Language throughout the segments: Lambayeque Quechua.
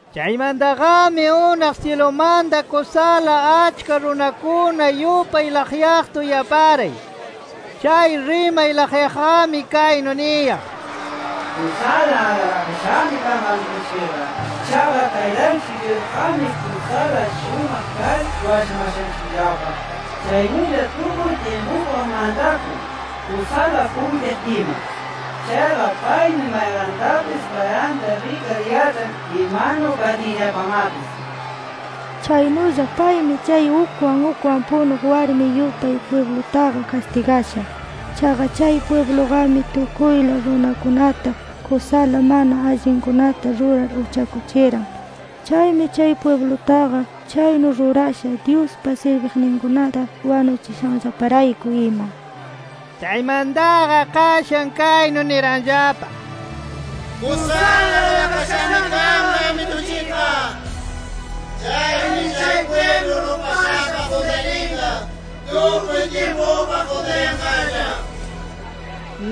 Chaymantaqami unaq syilumanta kusala achka runakuna yupay laqyaqta uyaparay. Chay rimay laqyaqqami kaynu niyaq: “¡Kusala alabakashami kanqa Amitunchikqa! Chaqa Taytanchik Dyusqami kusala shumaq kar washamashanchikllapa. Chaynulla tukuy tyimpupaq mantakun, kusala puytiq ima. Chaqa paymi mayqantapis, karanta rikar yaĉhan imanu katinllapamapis. Chaynulla paymi chay ukwan ukwan punuq warmi yupay pwiblutaqa kastigasha. Chaqa chay pwibluqami, tukuyla runakunata kusala mana allinkunata rurar uchakuchiran. Chaymi chay pwiblutaqa chaynu rurasha, Dyuspa sirbiqninkunata wanuchishanllaparayku ima”. Chaymantaqa qashan kaynu niranllapa: “¡Kusala alabakashami kanqa Amitunchikqa! Chaymi chay pwiblu rupashapa quntayninqa, tukuy tyimpupaq quntayanqalla” nir.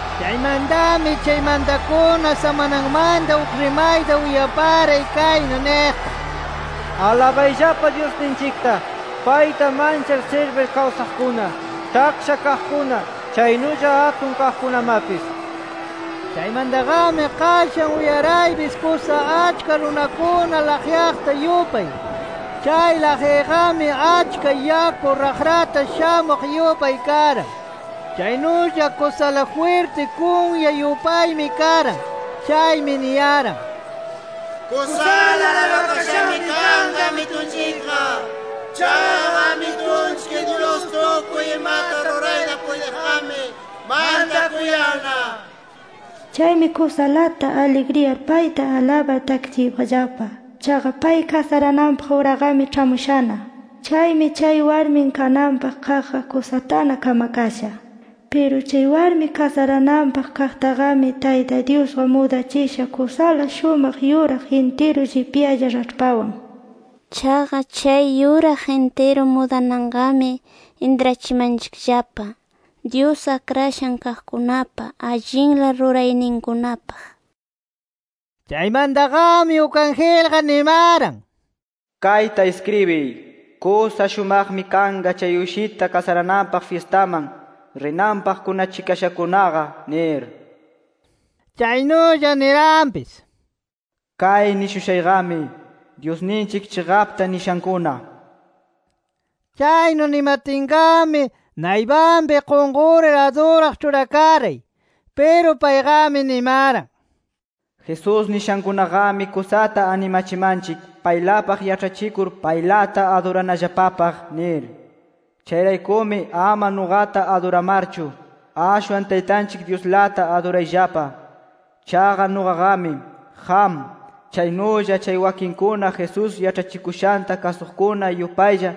Chaymantami chay mantakuna samanamanta uk rimayta uyaparay kaynu niqta: “¡Alabayllapa Dyusninchikta, Payta manchar sirbir kawsaqkuna, taksha kaqkuna chaynulla atun kaqkunamapis!” nir. Chaymantaqami qashan uyaraypis kusa achka runakuna laqyaqta yupay. Chay laqyayqami achka yaku raqrata shamuq yupay karan. Chaynulla kusala jwirti kunya yupaymi karan. Chaymi niyaran: “¡Kusala alabakashami kanqa Amitunchikqa! Chaqa Amitunchik Dyus tukuy imata rurayta puytiqqami, mantakuyanna nir. Chaymi kusalata aligriyar payta alabar takichiypaqllapa. Chaqa pay kasarananpaq uraqami ĉhamushana. Chaymi chay warmin kananpaq kaqqa, kusatana kamakasha. Piru chay warmi kasarananpaq kaqtaqami Tayta Dyusqa mudachisha kusala shumaq yuraq intiru llipyalla raĉhpawan”. Chaqa chay yuraq intiru mudananqami intrachimanchikllapa, Dyus akrashan kaqkunapa allinla rurayninkunapaq. Chaymantaqami uk angelqa nimaran: “Kayta iskribiy: ‘Kusa shumaqmi kanqa chay Uyshita kasarananpaq fyistaman, rinanpaq kunachikashakunaqa’ nir”. Chaynulla niranpis: “Kay nishushayqami, Dyusninchik chiqapta nishankuna” nir. Chaynu nimatinqami, naypanpi qunqurir aduraq ĉhurakaray. Piru payqami nimaran: “Jesús nishankunaqami kusata animachimanchik paylapaq yaĉhachikur paylata aduranallapapaq nir. Chayraykumi ama nuqata aduramarchu, ashwan Taytanchik Dyuslata adurayllapa. Chaqa nuqaqami, qam, chaynulla chay wakinkuna, Jesús yaĉhachikushanta kasuqkuna yupaylla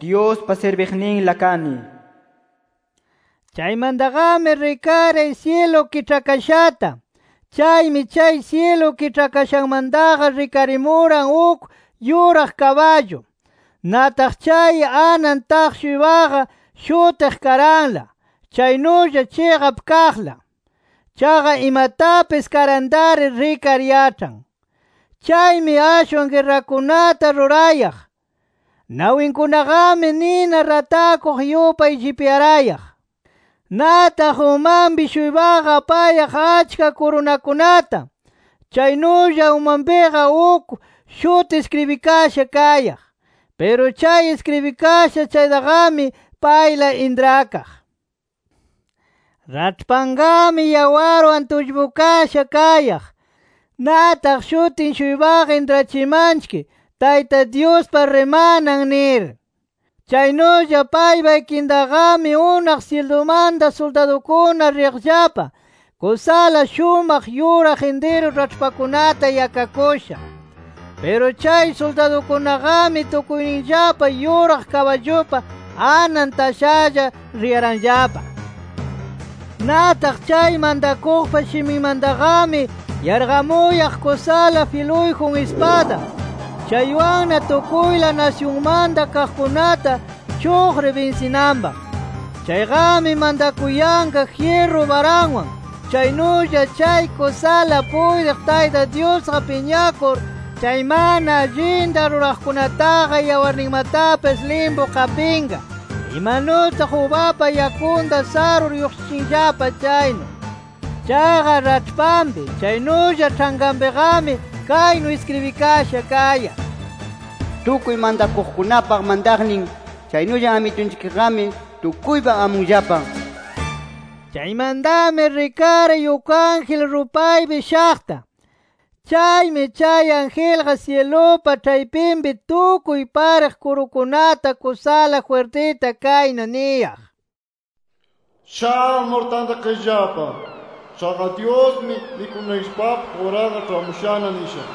Dyuspa sirbiqninla kani” nir. Chaymantaqami rikaray syilu kiĉhakashata. Chaymi chay syilu kiĉhakashamantaqa rikarimuran uk yuraq kaballu. Nataq chay anan taq-shuypaqa, shutiq KARANLA chaynulla CHIQAP KAQLA. Chaqa imatapis karantari rikar yaĉhan. Chaymi ashwan guerrakunata rurayaq. Nawinkunaqami, nina ratakuq yupay llipyarayaq. Nataq umanpi-shuypaqa apayaq achka kurunakunata. Chaynulla umanpiqa uk shuti iskribikasha kayaq. Piru chay iskribikasha chaytaqami, payla intrakaq. Raĉhpanqami yawarwan tullpukasha kayaq. Nataq shutin-shuypaqa intrachimanchik TAYTA DYUSPA RIMANAN nir. Chaynulla paypa ikintaqami, unaq syilumanta suldadukuna riyaqllapa, kusala shumaq yuraq intiru raĉhpakunata yakakusha. Piru chay suldadukunaqami tukuyninllapa yuraq kaballupa anan tashalla riyaranllapa. Nataq chay mantakuqpa shiminmantaqami, yarqamuyaq kusala filuyjun ispada, chaywanna tukuyla nasyunmanta kaqkunata chuqrir binsinanpaq. Chayqami mantakuyanqa jyirru baranwan. Chaynulla chay kusalata puytiq Tayta Dyusqa piñakur chay mana allinta ruraqkunapataqa yawarninmatapis limpu qapinqa imanutaq ubapa yakunta sarur lluqshichinllapa chaynu. Chaqa raĉhpanpi, chaynulla ĉhankanpiqami, kaynu iskribikasha kayaq: “Tukuy mantakuqkunapa mantaqnin. Chaynulla Amitunchikqami tukuypa amunllapa” nir. Chaymantami rikaray uk ángel rupaypi shaqta. Chaymi chay angelqa, syilupa ĉhaypinpi tukuy pariq kurukunata kusala jwirtita kaynu niyaq: “¡Shamur tantakayllapa! Chaqa Dyusmi, mikunaykillapapaq uraqa ĉhamushana nisha.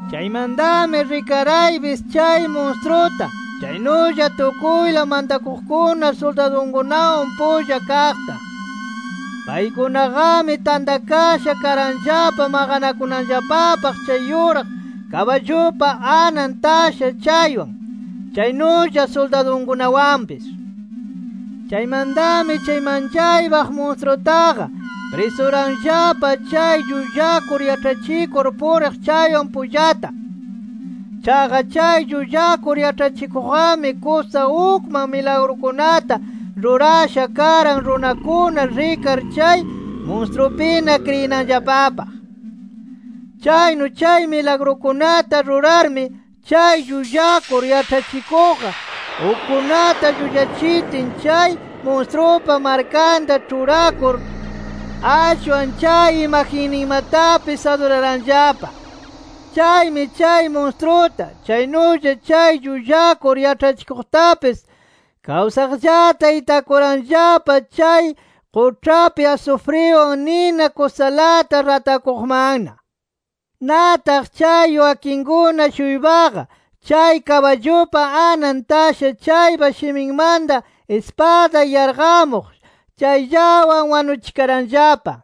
Chaymantami rikaraypis chay munstruta, chaynulla tukuyla mantakuqkuna suldadunkunawan pulla kaqta. Paykunaqami tantakasha karanllapa maqanakunanllapapaq chay yuraq kaballupa anan tasha chaywan, chaynulla suldadunkunawanpis. Chaymantami chay manchaypaq munstrutaqa, prisuranllapa chay llullakur yaĉhachikur puriq chaywan pullata. Chaqa chay llullakur yaĉhachikuqqami kusa ukman milagrukunata rurasha karan runakuna rikar chay munstrupina kriyinanllapapaq. Chaynu chay milagrukunata rurarmi, chay llullakur yaĉhachikuqqa, ukkunata llullachitin chay munstrupa markanta ĉhurakur, ashwan chay imagenninmatapis aduraranllapa. Chaymi chay munstruta, chaynulla chay llullakur yaĉhachikuqtapis, kawsaqllata itakuranllapa chay quĉhapi asufriwan nina kusalata ratakuqmanna. Nataq chay wakinkuna-shuypaqa, chay kaballupa anan tasha chaypa shiminmanta ispada yarqamuq chayllawan wanuchikaranllapa.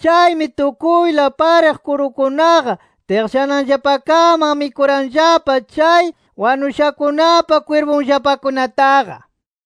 Chaymi tukuyla pariq kurukunaqa tiqllananllapakaman mikuranllapa chay wanushakunapa kwirpunllapakunataqa.